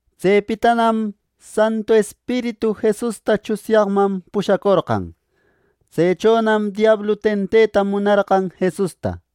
Tsepitanam Santu Espiritu Jesusta tsunyaqman pushacorqan. Tsechonam diablu tenteta munarqan Jesusta.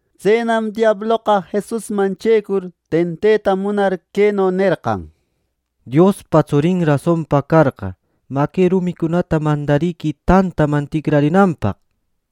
Tsenam diabloqa Jesusman checur, tenteta munar queno nerqan: —Diospa tsurin rasonpa carqa, mä, que rumicunata mandariquï tantaman ticrarinanpaq —nir.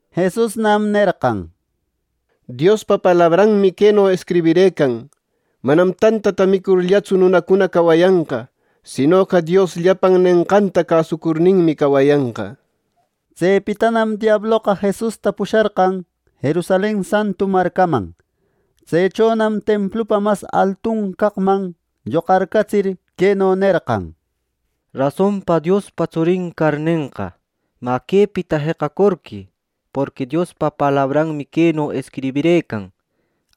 Jesusnam nerqan: —Diospa palabranmi queno escribirëcan: ‘Manam tantata micurllatsu nunacuna cawayanqa; sinoqa Dios llapan nenqanta cäsucurninmi cawayanqa’ —nir. Tsepitanam diabloqa Jesusta pusharqan Jerusalen santu marcaman. Tsechonam templupa mas altun caqman lloqarcatsir, queno nerqan: —Rasonpa Diospa tsurin carnenqa, mä, quepita jeqacorquï. Porqui Diospa palabranmi queno escribirëcan: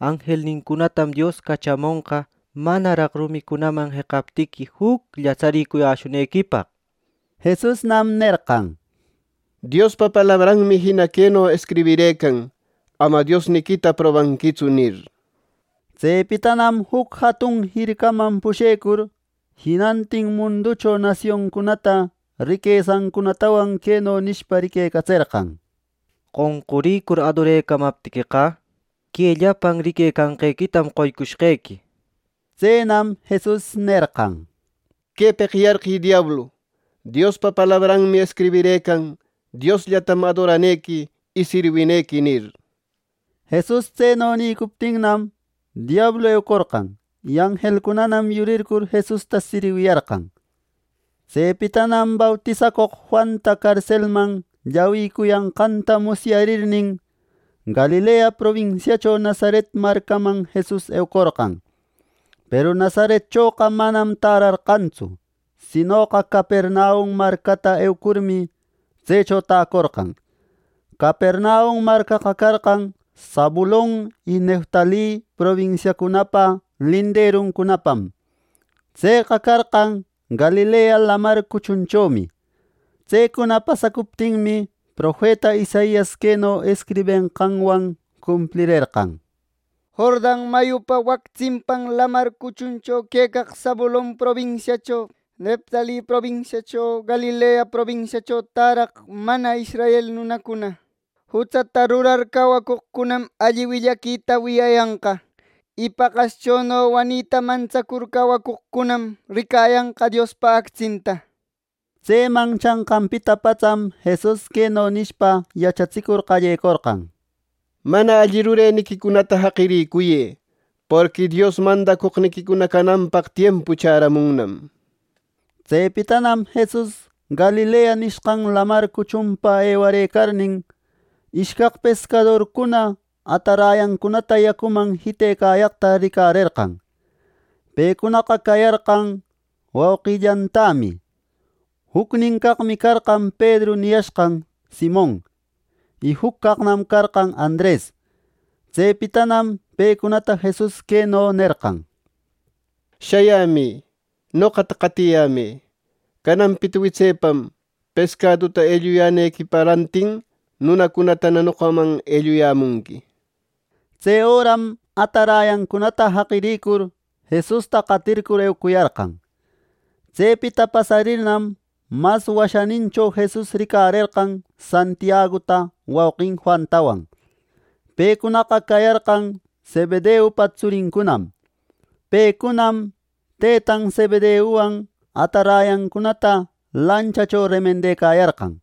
‘Anjelnincunatam Dios cachamonqa manaraq rumicunaman jeqaptiqui juclla tsaricuyäshunequipaq’ —nir. Jesusnam nerqan: —Diospa palabranmi jina queno escribirëcan: ‘Ama Diosniquita probanquitsu’ —nir. Tsepitanam juc jatun jircaman pushecur, jinantin munducho nasioncunata riquesancunatawan queno nishpa riquecatserqan: —Qonqurïcur adorecamaptiqueqa, que llapan riquecanqequitam qoycushqequi —nir. Tsenam Jesus nerqan: —¡Quepeq yarqï, diablu! Diospa palabranmi escribirëcan: ‘Diosllatam adoranequi y sirwinequi’ nir. Jesus tseno nïcuptinnam, diablu ewacorqan; y anjelcunanam yurircur Jesusta sirwiyarqan. Tsepitanam bautisacoq Juanta carselman llawïcuyanqanta musyarirnin, Galilea probinsiacho Nazaret marcaman Jesus eucorqan. Peru Nazaretchoqa manam tärarqantsu; sinoqa Capernaum marcata eucurmi, tsecho täcorqan. Capernaum marcaqa carqan Zabulon y Neftali probinsiacunapa linderunmanpam. Tseqa carqan Galilea Lamar cuchunchomi. Tsecuna pasacuptinmi, profeta Isaias queno escribenqanwan cumplirerqan: “Jordan mayupa wac tsimpan lamar cuchuncho quecaq Zabulon probinsiacho, Neftali probinsiacho, Galilea probisiacho täraq mana israel nunacuna, jutsata rurar cawacoqcunam alli willaquita wiyayanqa, y paqaschono wanita mantsacur cawacoqcunam ricayanqa Diospa actsinta” nir. Tseman chanqanpita patsam Jesus queno nishpa yachatsicur qallecorqan: “Mana alli rureniquicunata jaqiricuyë. Porqui Dios mandacoqniquicuna cananpaq tiempu chäramunnam” nir. Tsepitanam Jesus Galilea nishqan Lamar cuchunpa ewarëcarnin, ishcaq pescadorcuna atarayancunata yacuman jitecayaqta ricarerqan. Pecunaqa cayarqan wauqillantämi. Jucnin caqmi carqan Pedru niyashqan Simon, y juc caqnam carqan Andres. Tsepitanam pecunata Jesus queno nerqan: —¡Shayämï! Noqata qatiyämë. Cananpita witsepam pescaduta elluyanqequipa rantin nunacunatana noqaman elluyämunqui —nir. Tse öram atarayancunata jaqiricur, Jesusta qatircur eucuyarqan. Tsepita pasarirnam, mas washänincho Jesus ricarerqan Santiaguta wauqin Juantawan. Pecunaqa cayarqan Zebedeupa tsurincunam. Pecunam tëtan Zebedeuwan atarayancunata lanchacho remendecayarqan.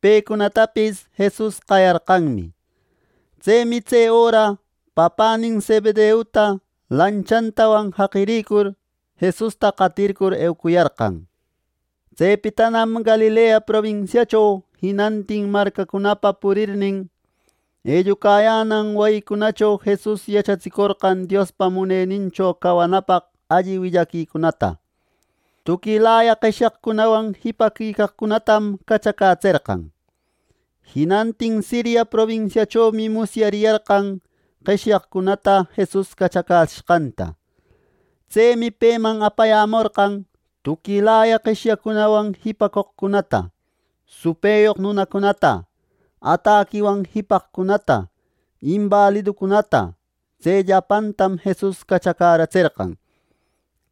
Pecunatapis Jesus qayarqanmi. Tsemi tse öra papänin Zebedeuta lanchatawan jaqiricur, Jesusta qatircur eucuyarqan. Tsepitanam Galilea probinsiacho jinantin marcacunapa purirnin, ellucayänan wayicunacho Jesus yachatsicorqan Diospa Munenincho canapaq alli willaquicunata. Tuquilaya qeshyacunawan jipaquicaqcunatam cachacätserqan. Jinantin Siria probinsiachomi musyariyarqan qeshyaqcunata Jesus cachacätsishqanta. Tsemi peman apayämorqan tuquilaya qeshyacunawan jipacoqcunata, supëyoq nunacunata, ataquiwan jipaqcunata, imbaliducunata. Tse llapantam Jesus cachacätserqan.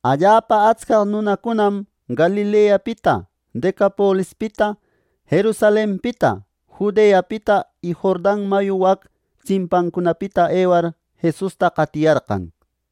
Allapa atscaq nunacunam Galileapita, Decapolispita, Jerusalenpita, Judeapita y Jordan mayu wac tsimpancunapita ewar Jesusta qatiyarqan.